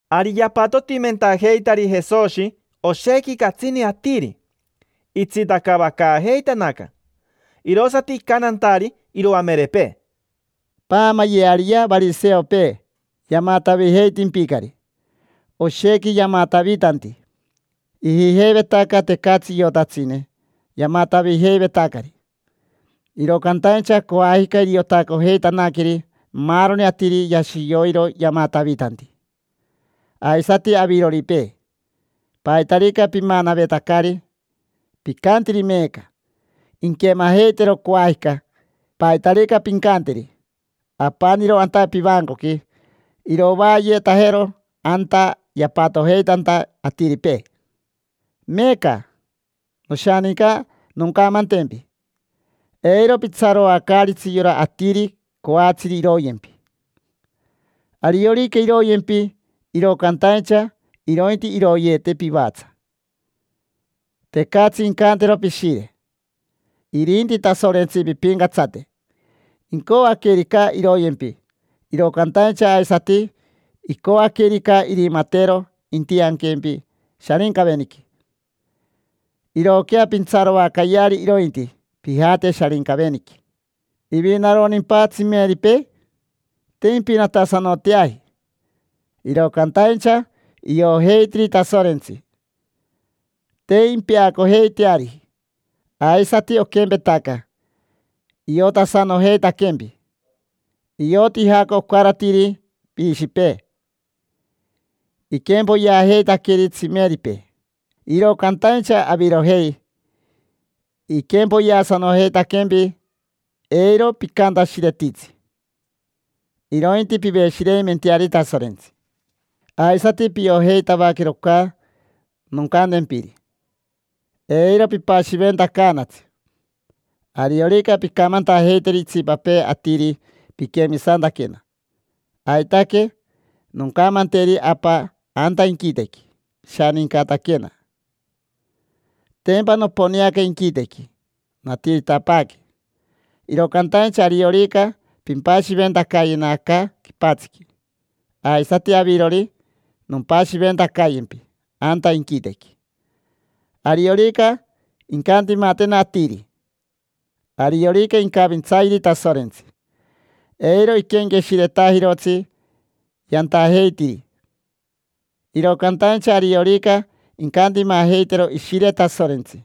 Ari yapatotimentajeitari Jesoshi oshequi catsini atiri, itsitacaavacaajeitanaca. Irosati icantantari iroamerepee: —Paamayeariyea variseopee, yamatavijeitimpicari. Oshequi yamatavitanti. Ijijeivetaca tecatsi iotatsine yamatavijeivetacari, iro cantaincha coajica iriotacojeitanaqueri maaroni atiri yashi yoiro yamatavitanti. Aisati aviroripee, paitarica pimanavetacari picantiri meeca, inquemajeitero coajica. Paitarica pincanteri apaniro anta pivancoqui, irovaayetajero anta yapatojeitanta atiripee. Meeca, noshaninca, noncamantempi: eiro pitsaroacaaritsi yora atiri coatsiri iroyempi. Ariorica iroyempi, iro cantaincha irointi iroyeete pivatsa. Tecatsi incantero pishire. Irinti Tasorentsi pimpincatsate: incoaquerica, iroyempi. Iro cantaincha aisati icoaquerica, irimatero intianquempi Sharincaveniqui. Irooquea pintsaroacayeari irointi pijate Sharincaveniqui. ¿Ivinaronimpa tsimeripee? Te impinatasanoteaji, iro cantaincha iojeitiri Tasorentsi: te impeacojeiteariji. Aisati oquempetaca, iotasanojeitaquempi: ioti jaoca ocaratiri piishipee. Iquempoyeajeitaqueri tsimeripee, iro cantaincha avirojei iquempoyeasanojeitaquempi. Eiro picantashiretitsi, irointi piveshireimenteari Tasorentsi. Aisati piojeitavaquero oca noncantempiri: eiro pipashiventacaanatsi, ariorica pincamantajeiteri itsipapee atiri piquemisantaquena, aitaque noncamanteri Apa anta inquitequi pishanincataquena. Tempa noponeaca inquitequi, natiritapaaque. Iro cantaincha ariorica pimpashiventacayena aca quipatsiqui, aisati avirori nompashiventacayempi anta inquitequi. Ariorica incantimatena atiri, ariorica incavintsayeri Tasorentsi, eiro iquenqueshiretajirotsi yantajeitiri. Iro cantaincha ariorica incantimajeitero Ishire Tasorentsi,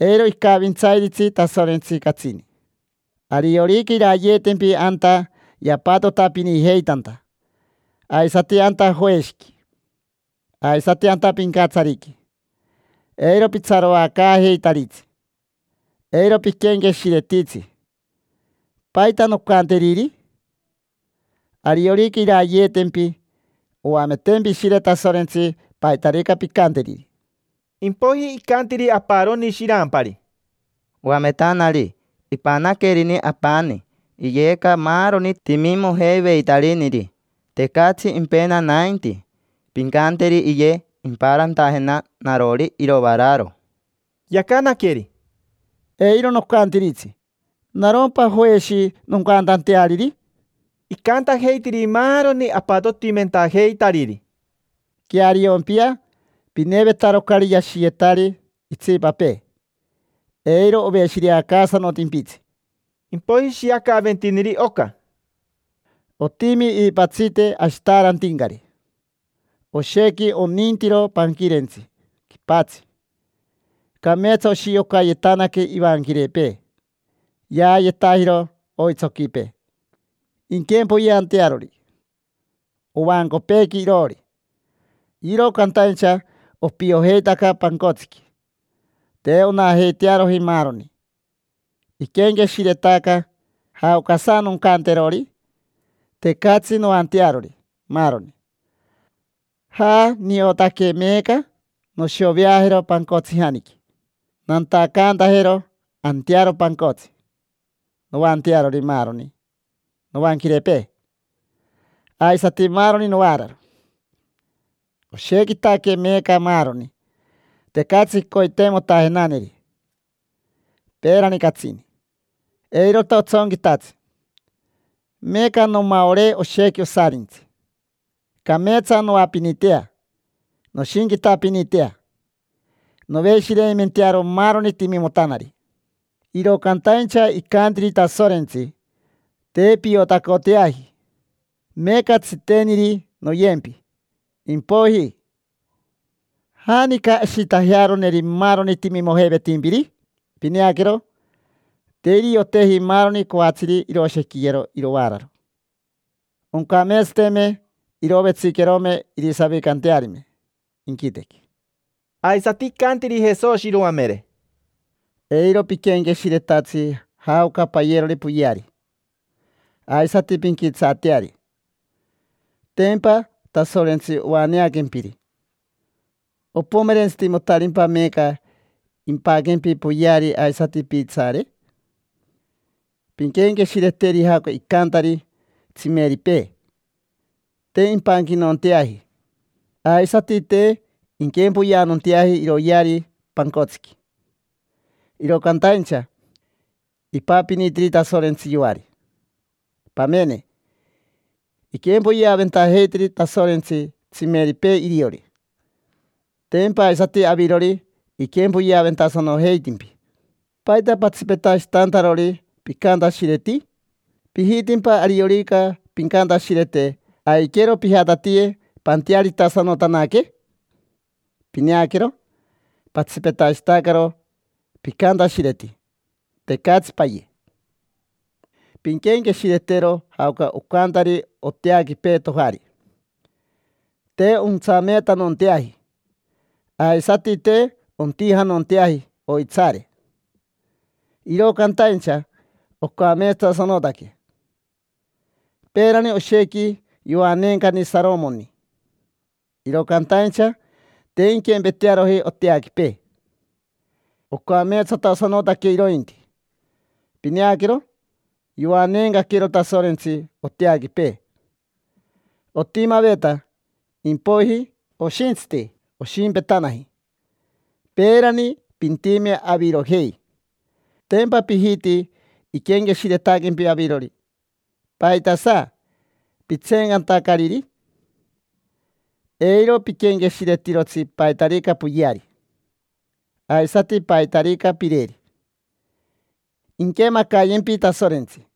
eiro icavintsairitsi Tasorentsi catsini. Ariorica irayeetempi anta yapatotapinijeitanta, aisati anta joeshiqui, aisati anta pincatsariqui, eiro pitsaroacaajeitaritsi. Eiro piquenqueshiretitsi: “¿Paita noncanteriri?” Ariorica irayeetempi, oametempi Ishire Tasorentsi paitarica pincanteriri. Impoiji icantiri aparoni shirampari: —Oametanari, ipanaquerini apani iyeca maaroni timimojeiveitariniri. Tecatsi impena nainti. Pincanteri iye impaarantajena narori irovaararo. Yacanaqueri: —Eiro nocantiritsi. ¿Narompa joeshi, noncantanteariri? Icantajeitiri maaroni apatotimentajeitariri: —Queariompia: pinevetarocari yashiyetari itsipapee, eiro oveshireacaasanotimpitsi. Impoiji ishiacaventiniri oca: —Otimi iipatsite ashitaarantincari. Oshequi onintiro panquirentsi quipatsi, cameetsa oshiocayetanaque ivanquirepee. Yaayetajiro oitsoquipee, inquempoyeantearori ovancopeequi iroori, iro cantaincha opiojeitaca pancotsiqui. Te onajeitearoji maaroni. Iquenqueshiretaca: “¿Jaocasa noncanterori? Tecatsi noantearori maaroni. Jaa, niotaque meeca: noshoveajero pancotsijaniqui, nantacantajero antearo pancotsi noantearori maaroni novanquirepee, aisati maaroni novaararo. Oshequitaque meeca maaroni, tecatsi coiteimotajenaneri. Peerani catsini, eirota otsonquitatsi; meeca nomaoree oshequi osarintsi. Cameetsa noapinitea, noshinquitapinitea, noveshireimentearo maaroni timimotanari”. Iro cantaincha icantiri Tasorentsi: “Te piotacoteaji. Meeca tsiteniri noyempi; impoiji, ¿janica ashitajearoneri maaroni timimojeivetimpiri?” Pineaquero, te irioteji maaroni coatsiri iroshequiyero irovaararo. Oncameetsateme irovetsiquerome irisavicantearime inquitequi. Aisati icantiri Jesoshi iroamere: —Eiro piquenqueshiretatsi jaoca payerori poyeari aisati pinquitsaateari. Tempa Tasorentsi oaneaquempiri. ¿Opomerentsitimotarimpa meeca impaquempi poyeari aisati piitsaare? Pinquenqueshireteri jaoca icantari tsimerepee: te impanquitanonteaji aisati te inquempoyeanonteaji iroyeari pancotsiqui, iro cantaincha ipapinitiri Tasorentsi yoari. Pamene, iquempoyeaventajeitiri Tasorentsi tsimeripee iriori, tempa aisati avirori iquempoyeaventasanojeitimpi. ¿Paita patsipetashitantarori picantashireti? ¿Pijitimpa ariorica pincantashirete aiquero pijatatiye pantearitasanotanaque? Pineaquero, patsipetashitacaro picantashireti. Tecatsi paye. Pinquenqueshiretero jaoca ocantari oteaquipee tojari. Te ontsameetanonteaji, aisati te ontijanonteaji oitsaare, iro cantaincha ocameetsatasanotaque. Peerani oshequi yoaneencani Saromoni, iro cantaincha te inquempetearoji oteaquipee: ocameetsatasanotaque irointi. Pineaquero, yoaneencaquero Tasorentsi oteaquipee. Otimaveta, impoiji oshintsiti oshimpetanaji. Peerani pintime avirojei: tempa pijiti iquenqueshiretaquempi avirori. ¿Paitasa pitseencantacariri? Eiro piquenqueshiretirotsi paitarica poyeari, aisati paitarica pireri: inquemacayempi Tasorentsi.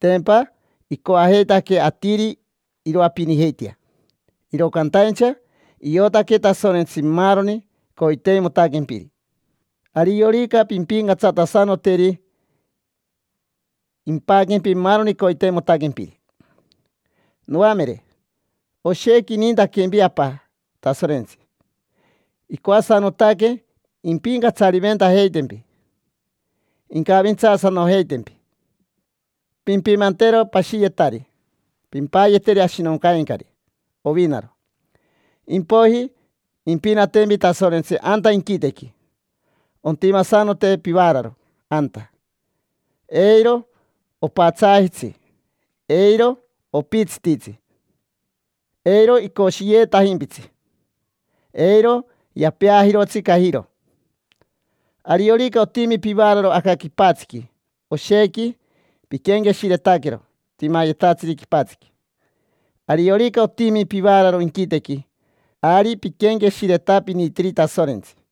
Tempa icoajeitaque atiri iroapinijeitea. Iro cantaincha iotaque Tasorentsi maaroni coiteimotaquempiri. Ariorica pimpincatsatasanoteri, impaquempi maaroni coiteimotaquempiri. Noamere, oshequi inintaquempi Apa Tasorentsi: icoasanotaque impincatsariventajeitempi, incavintsaasanojeitempi. Pimpimantero pashiyetari, pimpayeteri ashinoncaincari ovinaro. Impoiji impinatempi Tasorentsi anta inquitequi. Ontimasanote pivaararo anta: eiro opatsaajitsi, eiro opitsititsi, eiro icoshiyeetajimpitsi, eiro yapeajirotsi cajiro. Ariorica otimi pivaararo aca quipatsiqui, oshequi piquenqueshiretaquero timayetatsiri quipatsiqui. Ariorica otimi pivaararo inquitequi, ari piquenqueshiretapinitiri Tasorentsi.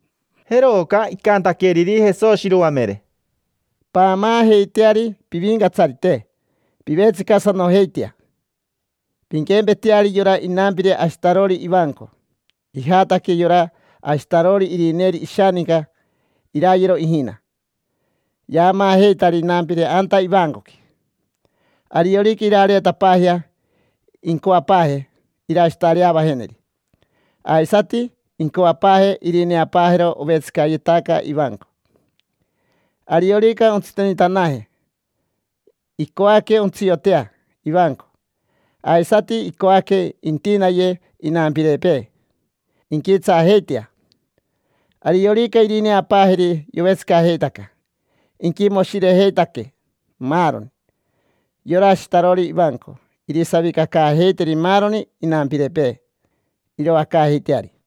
Jeroca icantaqueriri Jesoshi iroamere: —Paamaajeiteari pivincatsarite, pivetsicasanojeitea. Pinquempeteari yora inampire ashitarori ivanco. Ijataque yora ashitarori irineeri ishaninca irayero ijina. Yaamaajeitari inampire anta ivancoqui. Ariorica irareetapaajea incoapaaje irashitareavajeneri, aisati incoapaaje irineapaajero ovetsicayetaca ivanco. Ariorica ontsitenitanaje, icoaque ontsiotea ivanco. Aisati icoaque intinaye inampirepee, inquitsaajeitea. Ariorica irineapaajeri yovetsicajeitaca, inquimoshirejeitaque maaroni. Yora ashitarori ivanco irisavicacaajeiteri maaroni inampirepee, iroacaajeiteari.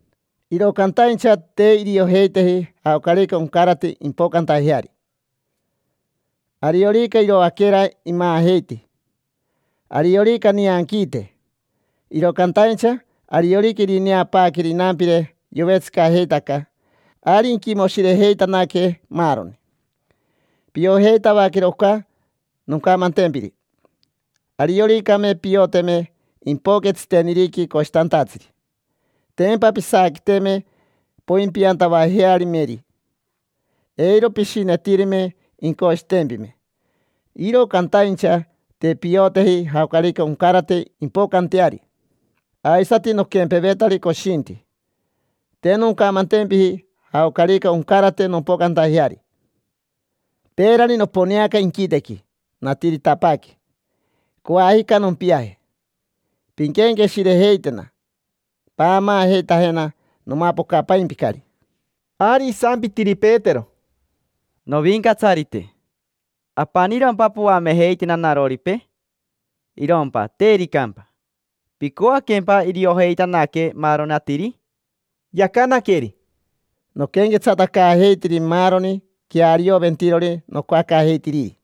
Iro cantaincha te iriojeiteji jaocarica oncarate impocantajeari: ariorica iroaquera imaajeiti, ariorica nianquiite. Iro cantaincha ariorica irineapaaqueri inampire yovetsicajeitaca, ari inquimoshirejeitanaque, maaroni. Piojeitavaquero oca noncamantempiri: arioricame pioteme impoque tsiteniriqui coshitantatsiri, tempa pisaaquiteme poimpiantavajearimeri, eiro pishinetirime incoshitempime. Iro cantaincha te pioteji jaocarica oncarate impocanteari. Aisati noquempevetari coshinti, te noncamantempiji jaocarica oncarate nompocantajeari. Peerani noponeaca inquitequi, natiritapaaque. Coajica nompiaje. Pinquenqueshirejeitena, paamaajeitajena: nomapocapaimpicari. Ari isampitiri Petero: —Novincatsarite, ¿apanirompa poamejeitena naroripee? Irompa tericampa, ¿picoaquempa iriojeitanaque maaroni atiri? Yacanaqueri: —Noquenquetsatacaajeitiri maaroni quearioventirori nocoacaajeitiriri.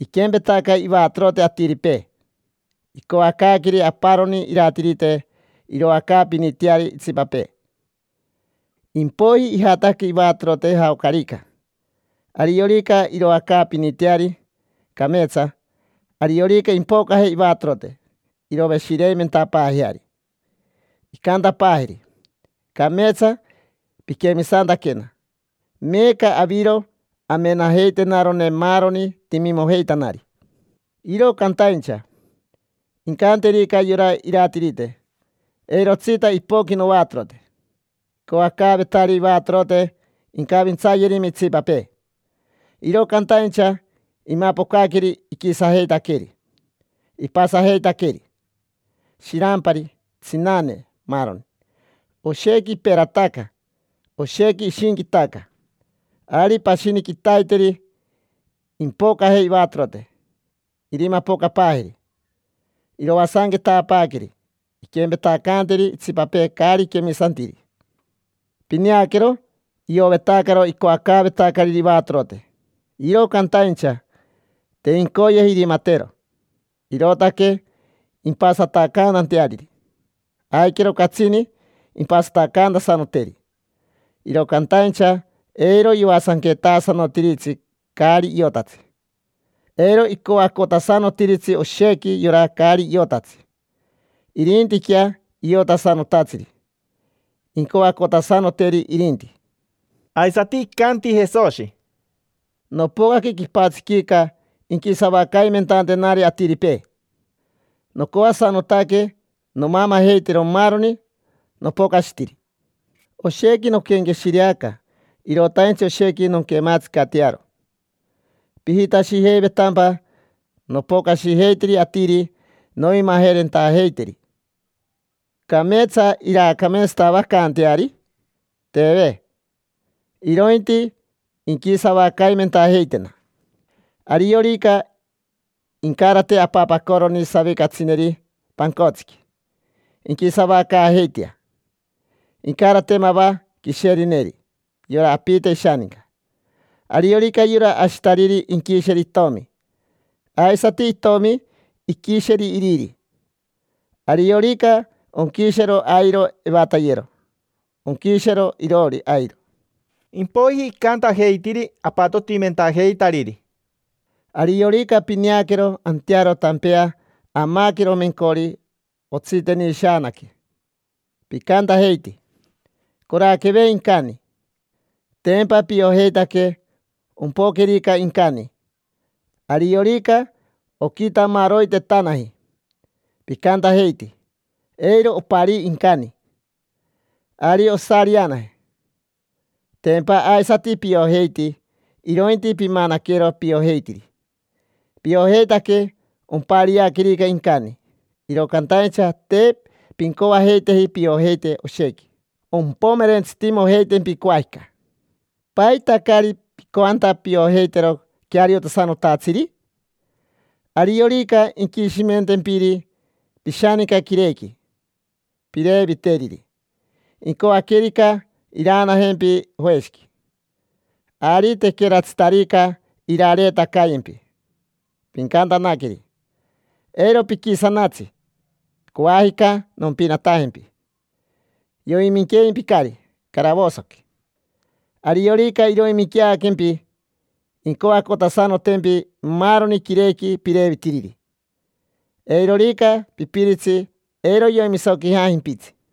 Iquempetaca ivatorote atiripee, icoacaaqueri aparoni iratirite iroacaapiniteari itsipapee. Impoiji ijataque ivatorote jaocarica. Ariorica iroacaapiniteari cameetsa, ariorica impocaje ivatorote, iroveshireimentapaajeari. Incantapaajeri: “Cameetsa piquemisantaquena. Meeca aviro amenajeitenarone maaroni timimojeitanari”. Iro cantaincha, incanterica yora iratirite: “Eirotsita ipoqui novatorote”. Icoacaavetari ivatorote incavintsayerime itsipapee, iro cantaincha imapocaqueri iquisajeitaqueri, ipasajeitaqueri: shirampari, tsinane, maaroni. Oshequi iperataca, oshequi ishinquitaca. Ari pashini quitaiteri impocaje ivatorote, irimapocapaajeri. Iroasanquetapaaqueri, inquempetacaanteri itsipapee caari quemisantiri. Pineaquero, iovetacaro icoacaavetacariri ivatorote, iro cantaincha te incoyeji irimatero. Irootaque impasatacantanteariri, aiquero catsini impasatacantasanoteri. Iro cantaincha eiro yoasanquetasanotiritsi caari iotatsi. Eiro icoacotasanotiritsi oshequi yora caari iotatsi. Irintiquea iotasanotatsiri, incoacotasanoteri irinti. Aisati icanti Jesoshi: —Nopocaque quipatsiquica inquisavacaimentantenari atiripee, nocoasanotaque nomamajeitero maaroni nopocashitiri. Oshequi noquenqueshireaca: irotaintsi oshequi nonquematsicatearo. ¿Pijitashijeivetampa nopocashijeitiri atiri noimajerentajeiteri, cameetsa iraacameetsatavacanteari? Teve, irointi inquisavacaimentajeitena. Ariorica incarate apapacoroni savicatsineri pancotsiqui, inquisavacaajeitea. Incarate mava quisherineri yora apite ishaninca. Ariorica yora ashitariri inquisheri itomi, aisati itomi iquisheri iriri. Ariorica onquishero airo evatayero, onquishero iroori airo. Impoiji icantajeitiri apatotimentajeitariri: —Ariorica pineaquero antearo tampea amaquero mencori otsitenishaanaque, picantajeiti: “Coraqueve incani”. Tempa piojeitaque ompoquerica incani. Ariorica oquitamaroitetanaji, picantajeiti: “Eiro oparii incani, ari osarianaje”. Tempa aisati piojeiti, irointi pimanaquero piojeitiri. Piojeitaque ompariaquerica incani. Iro cantaincha te pincoajeiteji piojeite oshequi ompomerentsitimojeitempi coajica. ¿Paita caari picoanta piojeitero queariosanotatsiri? Ariorica inquishimentempiri pishaninca quirequi pireviteriri, incoaquerica iraanajempi joeshiqui. Ari tequeratsitarica irareetacayempi, pincantanaqueri: “Eiro piquisanatsi, coajica nompinatajempi”. Yoiminqueimpicari caravosoqui. Ariorica iroiminqueaquempi, incoacotasanotempi maaroni quirequi pirevitiriri. Eirorica pipiritsi, eiro yoimisoquijajimpitsi.